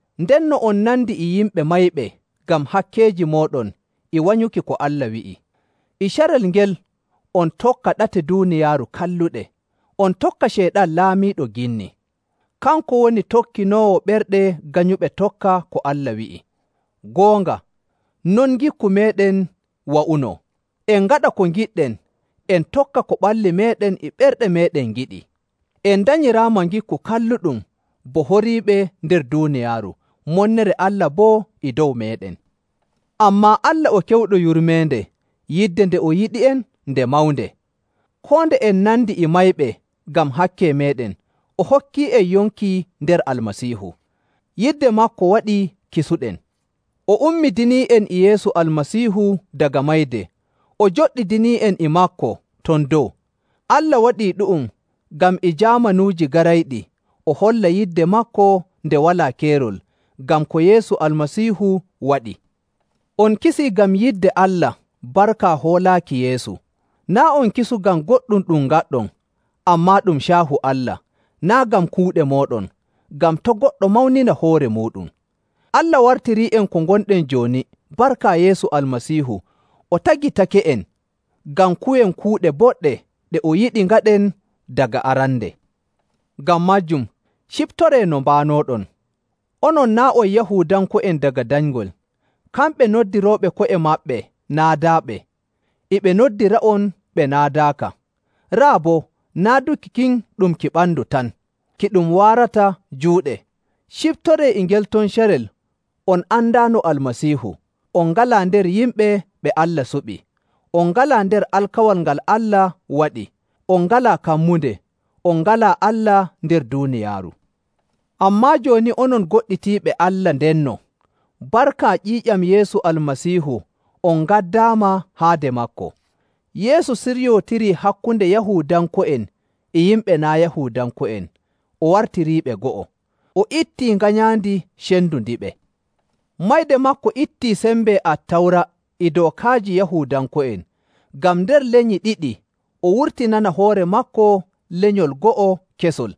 Ndenno on nandii e yimɓe mayɓe, ngam hakkeeji mooɗon e wanyuki ko Allah wi'i. E carel ngel on tokka ɗate duuniyaaru kalluɗe; on tokka Ceyɗan laamiiɗo ginni. Kanko woni tokkinoowo ɓerɗe ganyuɓe tokka ko Allah wi'i. Goonga, non ngikku meeɗen wa'unoo: en ngaɗa ko ngiɗɗen, en tokka ko ɓalli meeɗen e ɓerɗe meeɗen ngiɗi. En danyiraama ngikku kalluɗum bo horiiɓe nder duuniyaaru, monnere Allah boo e dow meeɗen. Ammaa Allah o kewɗo yurmeende. Yidde nde o yiɗi'en nde mawnde. Koo nde en nandi e mayɓe ngam hakke meeɗen, o hokkii'en yonki nder Almasiihu. Yidde maako waɗi kisuɗen.. O ummidinii'en e Yeesu Almasiihu daga mayde, o jooɗidini'en e maako ton dow. Allah waɗii ɗu'um ngam e jaamanuuji garayɗi o holla yidde maako nde walaa keerol ngam ko Yeesu Almasiihu waɗi. On kisii ngam yidde Allah barka hoolaaki Yeesu. Naa' on kisu ngam goɗɗum ɗum ngaɗɗon, ammaa ɗum caahu Allah, naa' ngam kuuɗe mooɗon, ngam to' goɗɗo mawnina hoore muuɗum. Allah wartirii'en ko ngonɗen jooni, barka Yeesu Almasiihu o tagitake'en ngam kuwen kuuɗe boɗɗe ɗe o yiɗi ngaɗen daga arande. Ngam maajum, ciftoree no mbaanooɗon. Onon naa' on Yahuudanko'en daga danyngol, kamɓe noddirooɓe ko'e maɓɓe “naadaaɓe,” e ɓe noddira'on “ɓe naadaaka.” Raa boo naaduki kin ɗum ki ɓandu tan, ki ɗum waarata juuɗe. Ciftoree e ngel ton carel on andaano Almasiihu, on ngalaa nder yimɓe ɓe Allah suɓi, on ngalaa nder alkawal ngal Allah waɗi, on ngalaa kammunde, on ngalaa Allah nder duuniyaaru. Ammaa jooni onon goɗɗitiiɓe Allah ndenno, barka ƴiiƴam Yeesu Almasiihu on ngaddaama haade maako. Yeesu siryootirii hakkunde Yahuudanko'en e yimɓe naa' Yahuudanko'en, o wartiriiɓe go'o. O ittii nganyaandi cendundiɓe. Mayde maako ittii sembe Attawra e dookaaji Yahuudanko'en, ngam nder lenyi ɗiɗi o wurtinana hoore maako lenyol go'o kesol.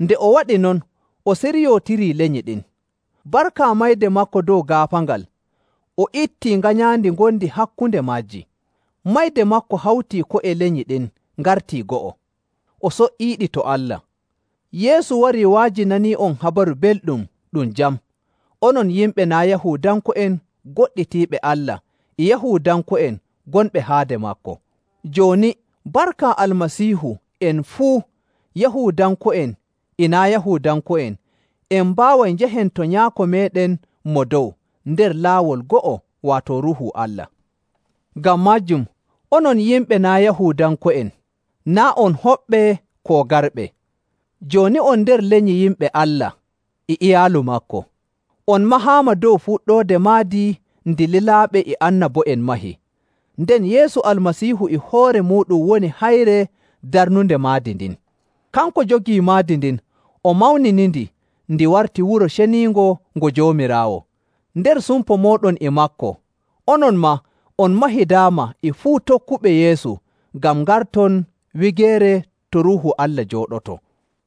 Nde o waɗi non o siryootirii lenyi ɗin.. Barka mayde maako dow gaafaangal, o ittii nganyaandi ngondi hakkunde maaji. Mayde maako hawtii ko'e lenyi ɗin ngartii go'o. O so''iiɗi to Allah.. Yeesu warii wa'ajinanii'on Habaru Belɗum ɗum jam, onon yimɓe naa' Yahuudanko'en goɗɗitiiɓe Allah e Yahuudanko'en gonɓe haade maako.. Jooni, barka Almasiihu en fuu, Yahuudanko'en e naa' Yahuudanko'en, en mbaaway njahen to Nyaako meeɗen Mo Dow nder laawol go'o, waato Ruuhu Allah. Ngam maajum, onon yimɓe naa' Yahuudanko'en, naa' on hoɓɓe koo garɓe. Jooni on nder lenyol yimɓe Allah e iyaalu maako. On mahaama dow fuɗɗoode maadi ndi lilaaɓe e annabo'en mahi, nden Yeesu Almasiihu e hoore muuɗum woni hayre darnunde maadi ndin. Kanko jogii maadi ndin o mawninindi ndi warti wuro ceniingo ngo Joomiraawo. Nder sumpo mooɗon e maako, onon maa on mahidaama e fuu tokkuɓe Yeesu ngam ngarton wigeere to Ruuhu Allah jooɗotoo.